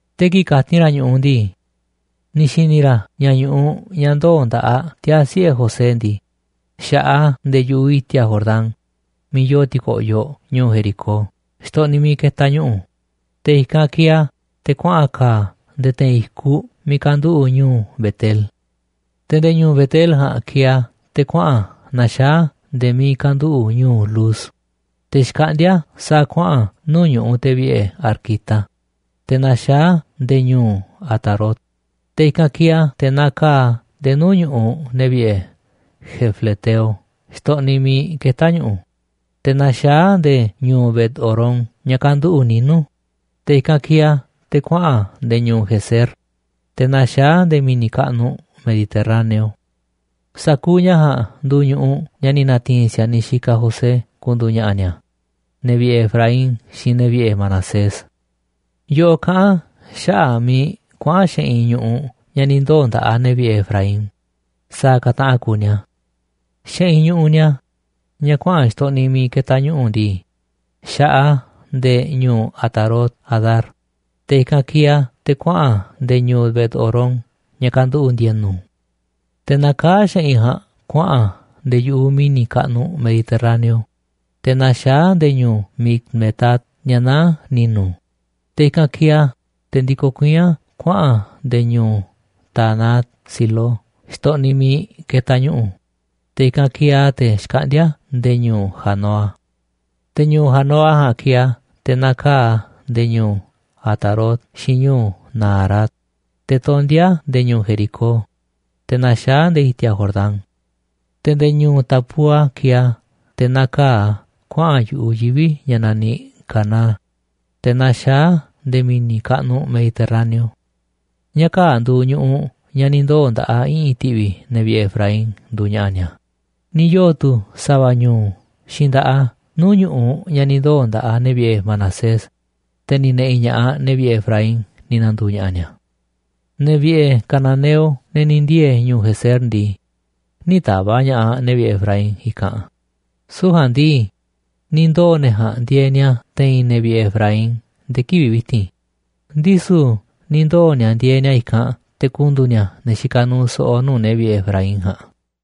Te̱ kii̱ꞌ kati̱n ra̱ ñu̱ꞌuꞌ ndii, ni̱ xi̱ni̱ ra̱ ña̱ ñu̱ꞌuꞌ ña̱ ndoo̱ nda̱ꞌaꞌ tiaa̱ siꞌe̱ José ndii, xa̱ꞌaꞌ a̱ nde̱e̱ yu̱ꞌuꞌ i̱ti̱a̱ Jordán, miiꞌ yoo ti̱ko̱ꞌyoꞌ ñu̱u̱ Jericó, xtoꞌniꞌ miiꞌ ketaꞌ ñu̱ꞌu̱, te̱ i̱kanꞌ kieeꞌ a̱ te̱ kuaꞌa̱n ka̱a̱ a̱ nde̱e̱ te̱i̱n i̱kuꞌ miiꞌ kanduꞌu̱ꞌ ñu̱u̱ Bet-el. Te̱ nde̱e̱ ñu̱u̱ Bet-el ja̱a̱nꞌ kieeꞌ a̱ te̱ kuaꞌa̱n a̱ naxaá a̱ nde̱e̱ miiꞌ kanduꞌu̱ꞌ ñu̱u̱ Luz, te̱ xkaꞌndíá sa̱a̱ kuaꞌa̱n nuu̱ꞌ ñu̱ꞌuꞌ te̱ vi̱ꞌe̱ arquita, te̱ naxaá a̱ nde̱e̱ ñu̱u̱ Atarot, te̱ i̱kanꞌ kieeꞌ a̱ te̱ nakaa̱ꞌ a̱ nde̱e̱ nuu̱ꞌ ñu̱ꞌuꞌ ne̱ vi̱ꞌe̱ jafleteo xtoꞌniꞌ miiꞌ ketá ñu̱ꞌu̱, te̱ naxaá a̱ nde̱e̱ ñu̱u̱ Bet-horón ña̱ kanduꞌu̱ꞌ ninu̱, te̱ i̱kanꞌ kieeꞌ a̱ te̱ kuaꞌa̱n a̱ nde̱e̱ ñu̱u̱ Gezer, te̱ naxaá a̱ nde̱e̱ mi̱ni̱ kaꞌnuꞌ Mediterráneo. Sa̱kuuꞌ ña̱ ja̱a̱nꞌ nduuꞌ ñu̱ꞌuꞌ ña̱ ni̱ na̱ti̱i̱n si̱a̱niꞌ xikaꞌ José ku̱ndu̱u̱ ña̱ꞌa̱ ni̱a̱, ne̱ vi̱ꞌe̱ Efraín xiinꞌ ne̱ vi̱ꞌe̱ Manasés. Yoꞌoꞌ kaꞌán a̱ xaꞌa̱ꞌ miiꞌ kuaꞌa̱n xeꞌinꞌ ñu̱ꞌuꞌ ña̱ ni̱ ndoo̱ nda̱ꞌaꞌ ne̱ vi̱ꞌe̱ Efraín sa̱a̱ ka̱ taꞌan kuuꞌ ni̱a̱. Xeꞌinꞌ ñu̱ꞌuꞌ ni̱a̱, ña̱ kuaꞌa̱n xtoꞌniꞌ miiꞌ ketaꞌ ñu̱ꞌu̱ ndii, xa̱ꞌaꞌ a̱ nde̱e̱ ñu̱u̱ Atarot-adar, te̱ i̱kanꞌ kieeꞌ a̱ te̱ kuaꞌa̱n a̱ nde̱e̱ ñu̱u̱ Bet-horón ña̱ kanduꞌu̱ꞌ ndi̱e̱nu̱. Te̱ nakaá xeꞌinꞌ ja̱a̱nꞌ kuaꞌa̱n a̱ nde̱e̱ yu̱ꞌuꞌ mi̱ni̱ kaꞌnuꞌ Mediterráneo, te̱ naxaá a̱ nde̱e̱ ñu̱u̱ Micmetat ña̱ naá ni̱nu̱, te̱ i̱kanꞌ kieeꞌ a̱ te̱ ndikoꞌ kuiín a̱ kuaꞌa̱n a̱ nde̱e̱ ñu̱u̱ Taanat-silo xtoꞌniꞌ miiꞌ ketaꞌ ñu̱ꞌu̱, te̱ i̱kanꞌ kieeꞌ a̱ te̱ xkaꞌndíá nde̱e̱ ñu̱u̱ Janoa. Te̱ ñu̱u̱ Janoa ja̱a̱nꞌ kieeꞌ a̱ te̱ nakaa̱ꞌ a̱ nde̱e̱ ñu̱u̱ Atarot xiinꞌ ñu̱u̱ Naarat, te̱ tondíá a̱ nde̱e̱ ñu̱u̱ Jericó, te̱ naxaá a̱ nde̱e̱ i̱ti̱a̱ Jordán. Te̱ nde̱e̱ ñu̱u̱ Tapúa kieeꞌ a̱ te̱ nakaa̱ꞌ a̱ kuaꞌa̱n yu̱ꞌuꞌ yivi̱ ña̱ naniꞌ Caná, te̱ naxaá a̱ nde̱e̱ mi̱ni̱ kaꞌnuꞌ Mediterráneo. Ña̱ kaa̱ꞌ nduuꞌ ñu̱ꞌuꞌ ña̱ ni̱ ndoo̱ nda̱ꞌaꞌ i̱ꞌi̱n ti̱ꞌvi̱ ne̱ vi̱ꞌe̱ Efraín nduuꞌ ña̱ꞌa̱ ni̱a̱. Ni̱ yoo̱ tu̱ sa̱va̱ ñu̱u̱ xiinꞌ nda̱ꞌaꞌ a̱ nuu̱ꞌ ñu̱ꞌuꞌ ña̱ ni̱ ndoo̱ nda̱ꞌaꞌ ne̱ vi̱ꞌe̱ Manasés, te̱ ni̱ ne̱ꞌi̱ ña̱ꞌaꞌ ne̱ vi̱ꞌe̱ Efraín ni̱ na̱ndu̱u̱ ña̱ꞌa̱ ni̱a̱. Ne̱ vi̱ꞌe̱ cananeo, ne̱ ni̱ ndiee̱ ñu̱u̱ Gezer ndii, nï̱ ta̱va̱ꞌ ña̱ꞌaꞌ ne̱ vi̱ꞌe̱ Efraín i̱kanꞌ, süu̱ꞌ ja̱a̱nꞌ ndii, ni̱ ndoo̱ ne̱ ja̱a̱nꞌ ndieeꞌ ni̱a̱ te̱i̱n ne̱ vi̱ꞌe̱ Efraín nde̱e̱ kivi̱ꞌ vi̱ti̱n. Ndisu̱ ni̱ ndoo̱ ni̱a̱ ndieeꞌ ni̱a̱ i̱kanꞌ te̱ ku̱ndu̱u̱ ni̱a̱ ne̱ xikaꞌ nuuꞌ so̱ꞌo̱ nuu̱ꞌ ne̱ vi̱ꞌe̱ Efraín ja̱a̱nꞌ.